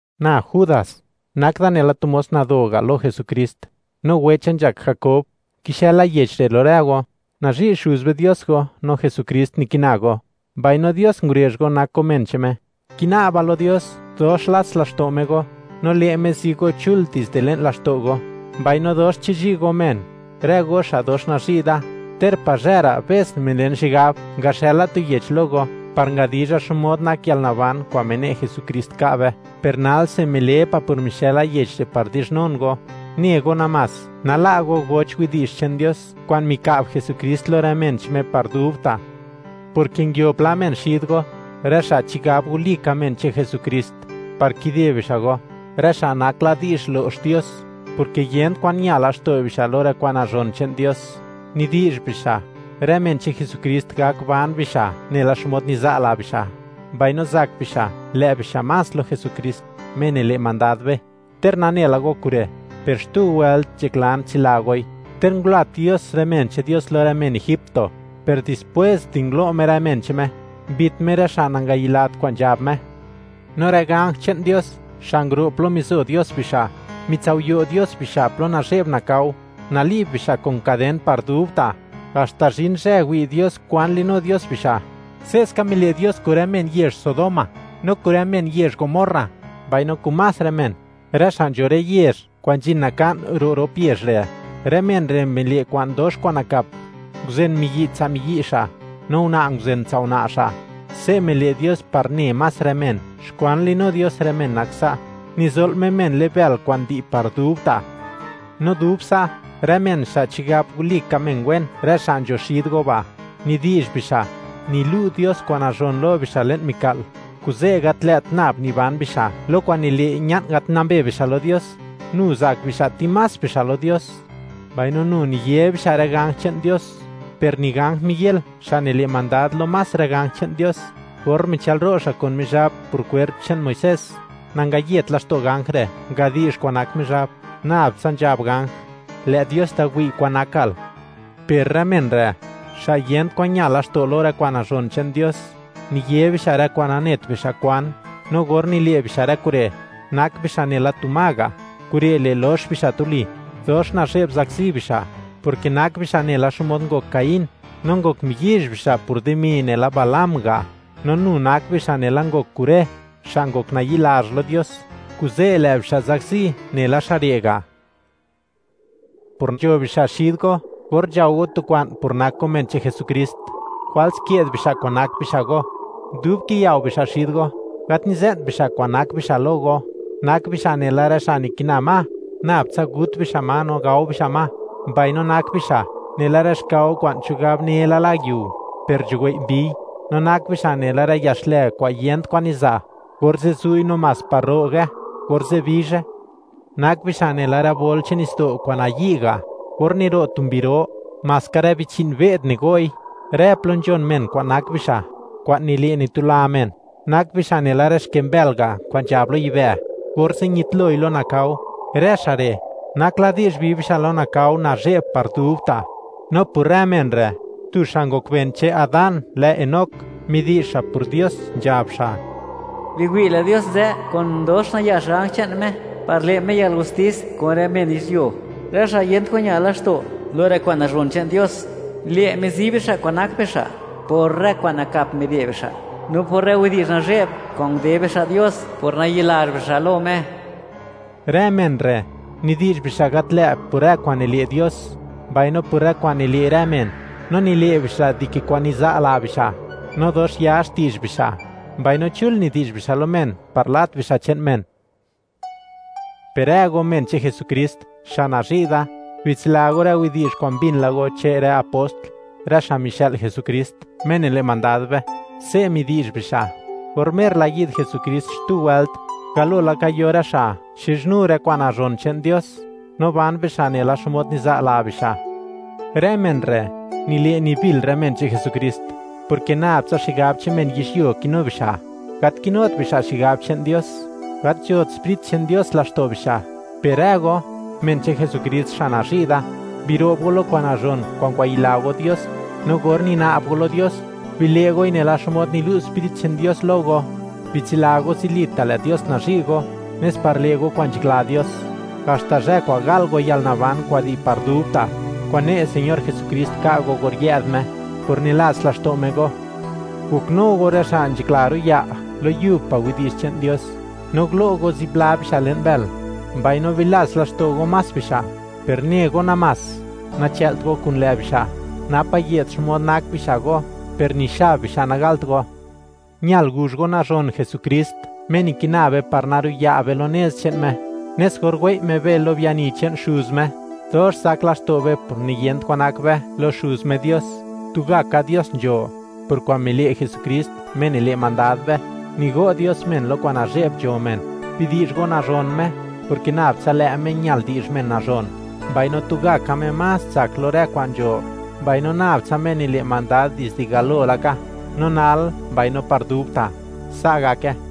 Na Judas, nak da nela tu mos nado ga' lo Jesukrist, no wecha nzhak Jakob; kixëla yech re' lo rë go; nazhi' Xuz be Dios go, no Jesukrist nikina go, mbaino Dios ngurezh go nak go men che'n Me. Kina'ba lo Dios, dox lats laxto' Me go, no le' Me zi go chul dizde le'n laxto' go, mbaino dox chizhi' go men. Rë go xa' dox nazhi' da, ter pazhë ra' be's milen xigab, ngaxëla tu yech lo go, par ngadizha xmod nak yalnaban kwa'n mine' Jesukrist ka' be; per nalse, mile pa' por mixë'la yech re' par dizhnun go, ne go namás, nala' go goch widi'zh che'n Dios kwa'n mika'b Jesukrist lo rë men che'n Me par dubta', porke nguio pla men xid go, rë xa' chigab walika men che'n Jesukrist, par kide bixa' go, rë xa' nak la di'zh lo'x Dios, porke yent kwan ña laxto' bixa' lo rë kwa'n nazhon che'n Dios. Nidi'zh bixa', rë men che'n Jesukrist gak ban bixa' nela xmod niza' la bixa', mbaino zak bixa', lë' bixa' más lo Jesukrist, Me nile' mandad be. Ter nane la go kure', per xtu wëlt nzhaklan tsila goi. Ter ngulat Dios rë men che'n Dios lo rë men Egipto, per dispwes di ngulo' Me rë men che'n Me, mbit Me rë xa' nangayilat kwa'n nzhab Me. No rë ganj che'n Dios xa' nguro' plo mizo Dios bixa', mitsao'yo' Dios bixa' plo nazhe'b nakao, nali'b bixa' kun kaden par dubta', haxta zhin zhë, wi' Dios kwan li'nu Dios bixa'. Se'ska mile' Dios kun rë men yezh Sodoma no kun rë men yezh Gomorra, mbaino kun más rë men, rë xa' nzho rë yezh kwa'n nzhin naka'n ro' rop yezh re'. Rë men re' mile' kwa'n dox kwa'n nakap, nguzen miyi' tsa' miyi' miyi', no una' nguzen tsa' una' una'. Se' mile' Dios par ne más rë men, xkwan nili'nu Dios rë men nak sa': nizo'l Me men le'n bël kwa'n di' par dubta'. No dub sa', rë men xa' chigab walika men wen, rë xa' nzho xid go ba', nidi'zh bixa', nilu' Dios kwa'n nazhon lo bixa' le'n mika'l, kuze' gat lë't nab niban bixa' lo kwa'n nile' ña'n gat nambe bixa' lo Dios; nu zak bixa' timás bixa' lo Dios, mbaino nu niye bixa' rë ganj che'n Dios. Per ni ganj Miguel, xa' nile' mandad lo más rë ganj che'n Dios, or michëlro' xa' kun Mizhab por kwerp che'n Muisés, nangayet laxto' ganj re', ngadi'zh xkwan nak Mizhab, nab tsa nzhab ganj: “Lë' Dios da wi' kwan nakal.” Per rë men re', xa' yent kwan ña laxto' lo rë kwa'n nazhon che'n Dios, niye bixa' rë kwa'n nanet bixa' kwan; no or nile' bixa' rë kure', nak bixa' nela tu ma ga'; kure' le' lox bixa' tuli. ¡Dox nazhe'b zakzi bixa'!, porke nak bixa' nela xmod ngok Caín; no ngok miyizh bixa' por dimi nela Balaam ga'; no nu nak bixa' nela ngok Coré, xa' ngok nayi'lazh lo Dios, kuze' lë' bixa' zakzi nela xa' re' ga'. Por nzho bixa' xid go or nzhao go tu kwa'n por nak go men che'n Jesukrist, jwals ke'd bixa' kwa'n nak bixa' go. Dub kiyao bixa' xid go, gat nize'nt bixa' kwa'n nak bixa' lo go. Nak bixa' nela rë xa' nikina ma, nab tsa gut bixa' ma no gao bixa' ma. Mbaino nak bixa' nela rë xkao kwa'n chigab une la yiu, per nzhuwei' mbiy; no nak bixa' nela rë ya xlë kwa'n niyent kwan niza', orze' zu'i namás par ro'ge orze' bizhe. Nak bixa' nela rë bol che'n nitsdo' kwa'n nayi' ga' or niro' tu mbi ro; maska rë bichi'n be'd nigo'i, rë plo nzhon men kwa'n nak bixa', kwa'n nile' nitula men; nak bixa' nela rë xke mbël ga' kwa'n nzhab lo yibë', orze' ñitloi lo nakao. Rë xa' re' nak la di'zh bi bixa' lo nakao nazhe'b par dubta'. No por rë men re', tu xa' ngok ben che'n Adán lë Enoc, midi'zh xa' por Dios, nzhab xa': “¡Biwi'!; lë' Dios nzë kun dox nayax ganj che'n Me, par le' Me yalgustis kun rë men yizhyuo, rë xa' yent kwan ña laxto' lo rë kwa'n nazhon che'n Dios; le' Me zi bixa' kwan nak bixa' por rë kwa'n nakap mile' bixa', no por rë widi'zh nazhe'b kwa'n nde bixa' Dios por nayi'lazh bixa' lo Me.” Rë men re', nidi'zh bixa' gat lë' por rë kwa'n nile' Dios mbaino por rë kwa'n nile' rë men; no nile' bixa' dike kwa'n niza' la bixa'. No dox ya xti'zh bixa', mbaino chul nidi'zh bixa' lo men par lat bixa' che'n men. Per rë go, men che'n Jesukrist, xa' nazhi' da; bitsila go rë widi'zh kwa'n mbin la go che'n rë apost, rë xa' mixë'l Jesukrist, Me nile' mandad be. Se' midi'zh bixa': “Or mer la yi'd Jesukrist xtu wëlt, galo laka yo rë xa' xizhnu rë kwa'n nazhon che'n Dios, no ban bixa' nela xmod niza' la bixa'.” Rë men re', nile' nibil rë men che'n Jesukrist, porke nab tsa xigab che'n men yizhyuo kinu bixa'; gat kinut bixa' xigab che'n Dios, gat nzhot Sprit che'n Dios laxto' bixa'. Per rë go, men che'n Jesukrist xa' nazhi' da; biro'b go lo kwa'n nazhon kwa'n ngwayila go Dios; no or nina'b go lo Dios, bile' goi nela xmod nilu' Sprit che'n Dios lo go. Bitsila go, zilita' lë' Dios nazhi' go, nes par le' go kwa'n nzhakla Dios, haxta zhë kwa'n gal go yalnaban kwa'n di' par dubta', kwa'n ne' Señor Jesukrist ka' go or yë'd Me, por nilats laxto' Me go. Goknu go rë xa' nzhakla ro'ya' lo yub pa' widi'zh che'n Dios, no gulo' go zipla bixa' le'n bël, mbaino bilats laxto' go más bixa', per ne go namás, nachëlt go kun lë' bixa', napa' ye'd xmod nak bixa' go; per ni xab bixa' nagalt go. Ñal guzh go nazhon Jesukrist, Me nikina be par naro'ya' be lo nez che'n Me, nes or wei' Me be lo biani che'n Xuz Me, dox zak laxto' be por niyent kwan nak be lo Xuz Me Dios. Tugaka Dios nzho; por kwa'n mile' Jesukrist, Me nile' mandad be, nigo' Dios men lo kwa'n nazhe'b nzho men. Bidi'zh go nazhon Me, porke nab tsa lë' Me ñal di'zh men nazhon, mbaino tugaka Me más tsak lo rë kwa'n nzho, mbaino nab tsa Me nile' mandad dizde galo laka, no nal, mbaino par dubta'. Sa' gake.